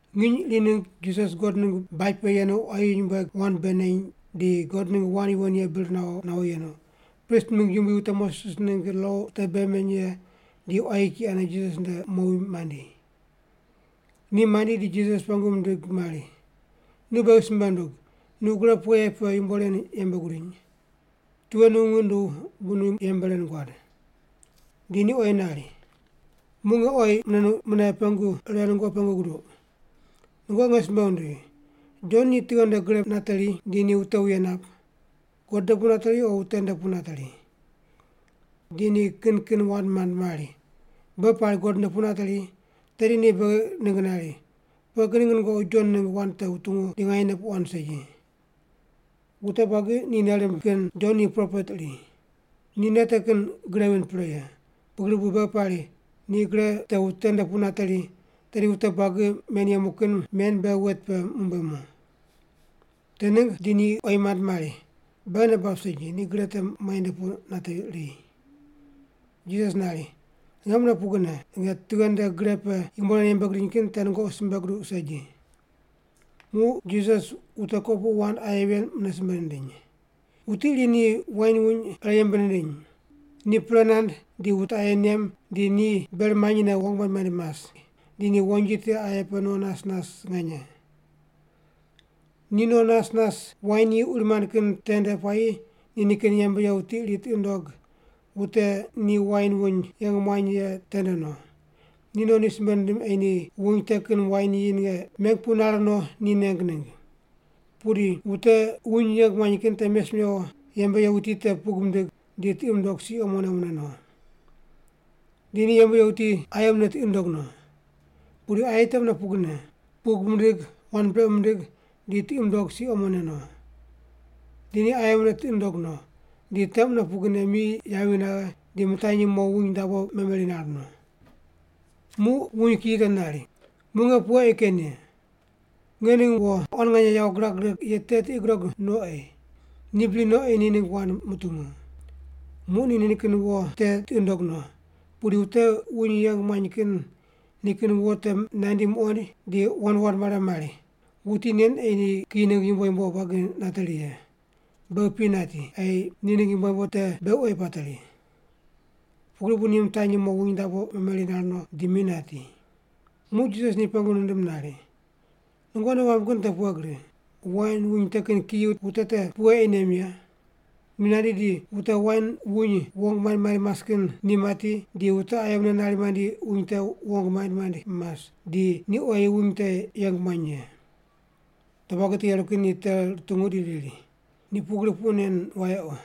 Nginy iri ningg Jisas God ningg baj pe yenu quayi nyumbueg wand bei neny, di God ningg wand yuwon ye bir nawo nawo yenu, prist mingg yumbui, wute Moses ningg lo wute bei meny ye, di quayi kiyi ane Jisas nde mowi mandi. Ni mandi di Jisas pengu mindig mari, “Nu beghi simbe ndug, nu gre pughe ye pe yumbo ren yembe gudiny? Tughe nu ngiq nunduw bu nu yembe ren guad?” Di ni oyi nari, “Muq nge oyi mune pengu ire nungoqi pengu guduq. Nungoqi nge simbe wundigh, Jon ni tughe nde gre nateri di ni wute wuye nap? God nde pu nateri o wute nde pu nateri.” Di ni kin kin wand mand mari, “Beghi pari God nde pu nateri, tedi ni beghi ningg nari, ‘Pughe kin ningg nungoqi Jon ningg wand te wutungu di nganyene puq wand segi?’ Wute buagi ni nei rimb kin Jon ni propet iri. Ni nei te kin gre vind pre ye, pugri bu beghi pari, ‘Ni gre te wute nde pu nateri,’ tedi wute buagi men yemu kin men beghi wet pe mumbuemu.” Te ningg di ni oyi mand kin mari, “Beghi nei bab segi, ni gre te muainde pu nateri.” Jisas nari, “Nge mune pugrine, nge tughe nde gre pe yumbo ren yembe gidiny kin te nungoqi simbe guduq segi.” Muq Jisas wute kopuqu wand aye ven mune simbe nindiny: “Wuti iri ni wain wuny ire yembe nindiny. Ni pre nand di wute aye nem di ni ber manyine wong maind maind mas, di ni wonji tiqe aye pe no nas nas nganye. Ni no nas nas wain yi uri mand kin tende puayi ni nikin yembe ye wuti iri tiqi nundog wute ni wain wuny yeng muany ye tende no. Ni no ni simbe nindim ei ni wuny te kin wain yi ninge meng pu nare no ni neng ningg. Pudi wute wuny yeng muany kin te mes mewo yembe ye wuti te pug mindig, di tiqi mundog si omone mune no. Di ni yembe ye wuti aye mune tiqi nundog no. Pudi aye te mune pugrine, pug mindig, wand brequ mindig, di tiqi mundog si omone no. Di ni aye mune tiqi nundog no, di te mune pugrine mi yavi naghe, di mitanyi mo wuny dabo memeri nar no. “Muq wuny kiyi te nari, ‘Muq nge pughe ei ken ye? Nge ning wo nganye, nge quan nganye yawo girag righe ye te tiqi gudog no ei. Ni bri no nari ei ni ni ningg wand mutungu.’ “Muq ni nikin wo te tiqi nundog no, pudi wute wuny yeng muany kin nikin wo te nandi muqoind, di wand wand mare mari, ‘Wuti nen ei ni kiyi ningg yumbo yumbo buagi nateri ye. Beghi pi nati, ei ni ningg yumbo yumbo te beghi oyi pateri.’ Pugri bu ni mitanyi mo wuny dabo memeri nar no di mi nati.” Muq Jisas ni pengu nindim nari, “Nungoqi nei wamb kin pughe gri. Wain wuny te kin kiyi wute te pughe ei nem ye? Ni nandi di wute wain wuny wong maind maind mas kin ni mati, di wute aye mune nari mandi wuny te wong maind maind mas, di ni oyi wuny te yeng muany ye.” Wute buagi te yeru kin ni te rutungu di riri, “Ni pugri puq nen wayequ.”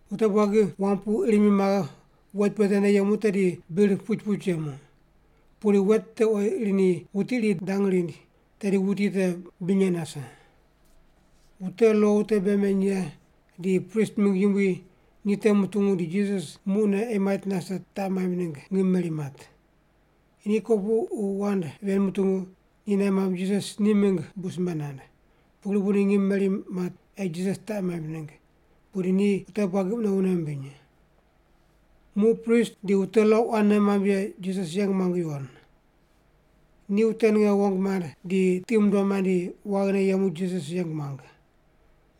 Wute buagi wam pu ir mi maghe wet pe tende yemu tedi bir puch puch yemu. Pudi wet te oyi ir ni wuti iri dang rind tedi wuti te binye nase.” Wute lo wute bei meny ye di prist mingg yumbui ni te mutungu di Jisas muqne ei mait nase taq maimb ningg ngim meri mat. Ni kopuqu wand ven mutungu, ni nei mamb Jisas ni mingg bu simbe nand. Pugri bu ni ngim meri mat ei Jisas taq maimb ningg, pudi ni wute buagi mune wune mimbiny. Muq prist di wute lo quan nei mamb ye Jisas yeng muang yuwon. Ni wute ninge wong mand di tiqi mundom mandi waghine yemu Jisas yeng muang.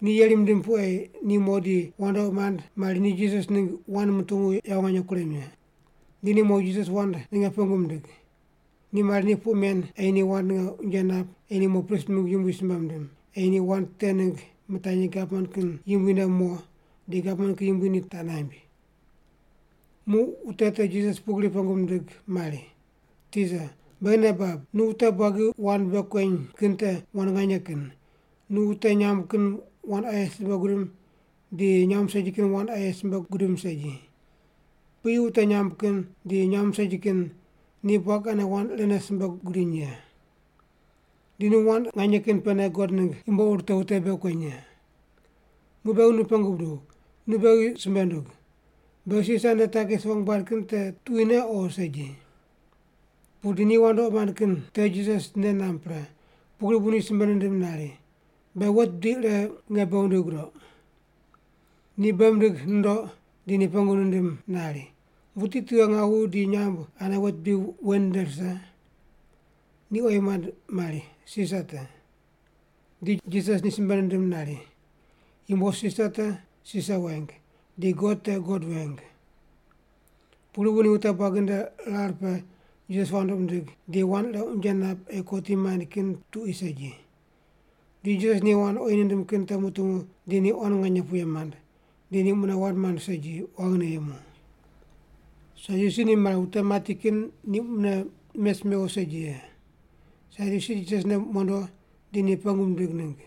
Ni yeri mindim pu ei ni mo di wandoqi mand mari ni Jisas ningg wand mutungu yawo nganye kurem ye. Di ni mo Jisas wand ninge pengu mindig. Ni mari ni puq men ei ni wand ninge unje nap ei ni mo prist mingg yumbui simbe mindim, ei ni wand te ningg mitanyi gavman kin yumbui nde mo, di gavman kin yumbui ni taq naimb. Muq wute te Jisas pugri pengu mindig mari, “Tisa, beghi nei bab, nu wute buagi wand bei kueny kin te wand nganye kin. Nu wute nyamb kin wand aye simbe gudim di nyamb segi kin wand aye simbe gudim segi. Piyi wute nyamb kin di nyamb segi kin ni buagi ane wand irene simbe gudiny ye. Di nu wand nganye kin pene God ningg yumbo ur te wute bei kueny ye. Muq beghi nu pengu buduw, nu beghi simbe ndug. Beghi Sisar nde takis wong bad kin te tuquine o segi?” Pudi ni wandoqi mand kin te Jisas nei namb pre, pugri bu ni simbe nindim nari, “Be wet bidi ire nge bei wundigh gudoq.” Ni bei mindig nundoq di ni pengu nindim nari, “Wuti tughe ngawu di nyamb ane wet bidi wen nde rise?” Ni oyi mand mari, “Sisar te.” Di Jisas ni simbe nindim nari, “Yumbo Sisar te, Sisar weng; di God te, God weng.” Pugri bu ni wute buagi nde rar pe Jisas wandoqi mindig, di wand ire unje nap ei kotim maind kin tuqui segi. Di Jisas ni wand oyi nindim kin te mutungu di ni quan nganye puye mand, di ni mune wand mand segi, waghine yemu. Sadyusi ni mari wute mati kin ni mune mes mewo segi ye. Sadyusi Jisas nde mondo di ni pengu mindig ningg.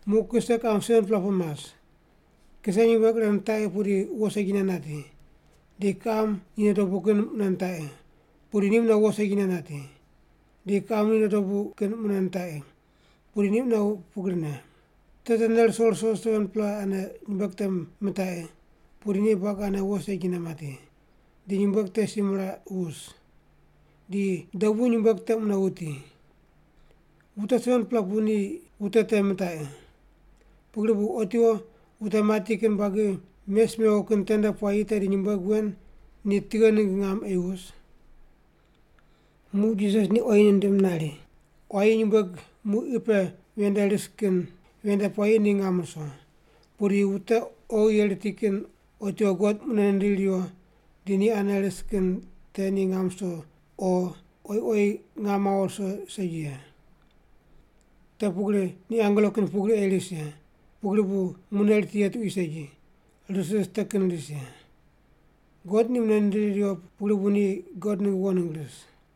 Muq kise kiqam 7-pela pu mas. Kiseyu nyumbueg ire nitaqi pudi wo segine nati. Di kiqam ni nde dobu kin mune nitaqi, pudi ni mune wo segine nati, di kiqam ni nde dobu kin mune nitaqi, pudi ni mune pugrine. Te tene ruso ruso 7-pela ane nyumbueg te mitaqi, pudi ni buagi ane wo segine mati, di nyumbueg te si miraq wus. Di dobu nyumbueg te mune wuti. Wute 7-pela pu ni wute te mitaqi. Pugri bu otiwo wute mati kin buagi mes mewo kin tende puayi tedi nyumbueg wen ni tughe ningg ngam ei wus?” Muq Jisas ni oyi nindim nari, “Quayi nyumbueg muq qi pe ven nde ris kin ven nde puayi ni ngam ruso. Pudi wute oghi ye riti kin otiwo God mune nindiri riwo di ni ane ris kin te ni ngam ruso o oyi oyi ngam mawo ruso segi ye. Te pugri ni angelo kin pugri ei ris ye, pugri bu mune riti ye tuqui segi, ris ris te kin ris ye. God ni mune nindiri riwo pugri bu ni God ningg wo ningg ris.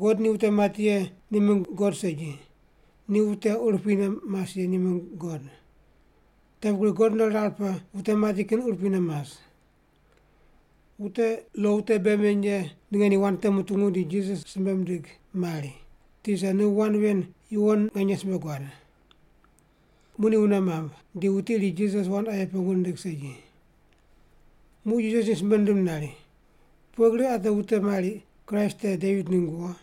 God ni wute mati ye ni mingg God segi, ni wute urupui ne mas ye ni mingg God. Te pugri God nde rar pe wute mati kin urupui ne mas.” Wute lo wute bei meny ye ninge ni wand te mutungu di Jisas simbe mindig mari, “Tisa, nu wand yuwon nganye simbe guad.” Muq ni wune mamb, di wuti iri Jisas wand aye pengu nindig segi. Muq Jisas ni simbe nindim nari, “Pughe gri ate wute mari Kraist te Devit ningg wo?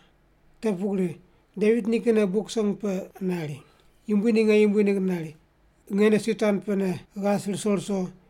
Te pugri Devit nikinne Buk Song pe nari, Yumbui ni nge yumbui ningg nari, ‘Nge nde si tuan pene ghas ruso ruso,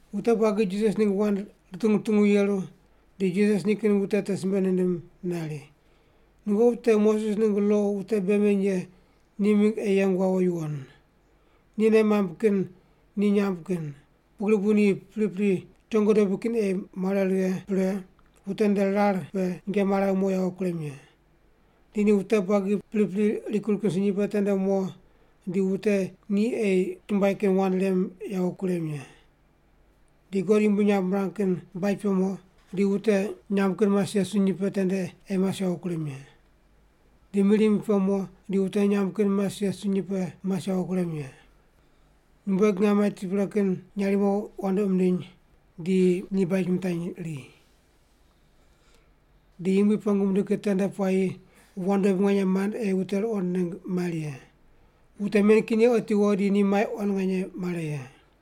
Wute buagi Jisas ningg wand rutungu rutungu yeru di Jisas nikin wute te simbe nindim nari, “Nungoqi wute Moses ningg lo wute bei meny ye ni mingg ei yeng wawo yuwon. Ni nei mamb kin ni nyamb kin, pugri bu ni pripri chongo dobui kin ei mare righe pre di wute nde rar pe nyinge mare mo yawo kurem ye. Di ni wute buagi pripri rikur kin sunyi pe tende mo di wute ni ei chumbuai kin wand rem yawo kurem ye. Di God yumbui nyamb mirang kin baj pe mo di wute nyamb kin mas ye sunyi pe tende ei mas yawo kurem ye. Di mir yumbui pe mo di wute nyamb kin mas ye sunyi pe ei mas yawo kurem ye. Nyumbueg ngaim mati pre kin nyarimo wandoqi mindiny, di ni baj mitanyri. Di Yumbui pengu mindig kin tende puayi wand dobui nganye mand ei wute ruqond ningg mari ye. Wute men kin ye otiwo di ni mai quan nganye mare ye.”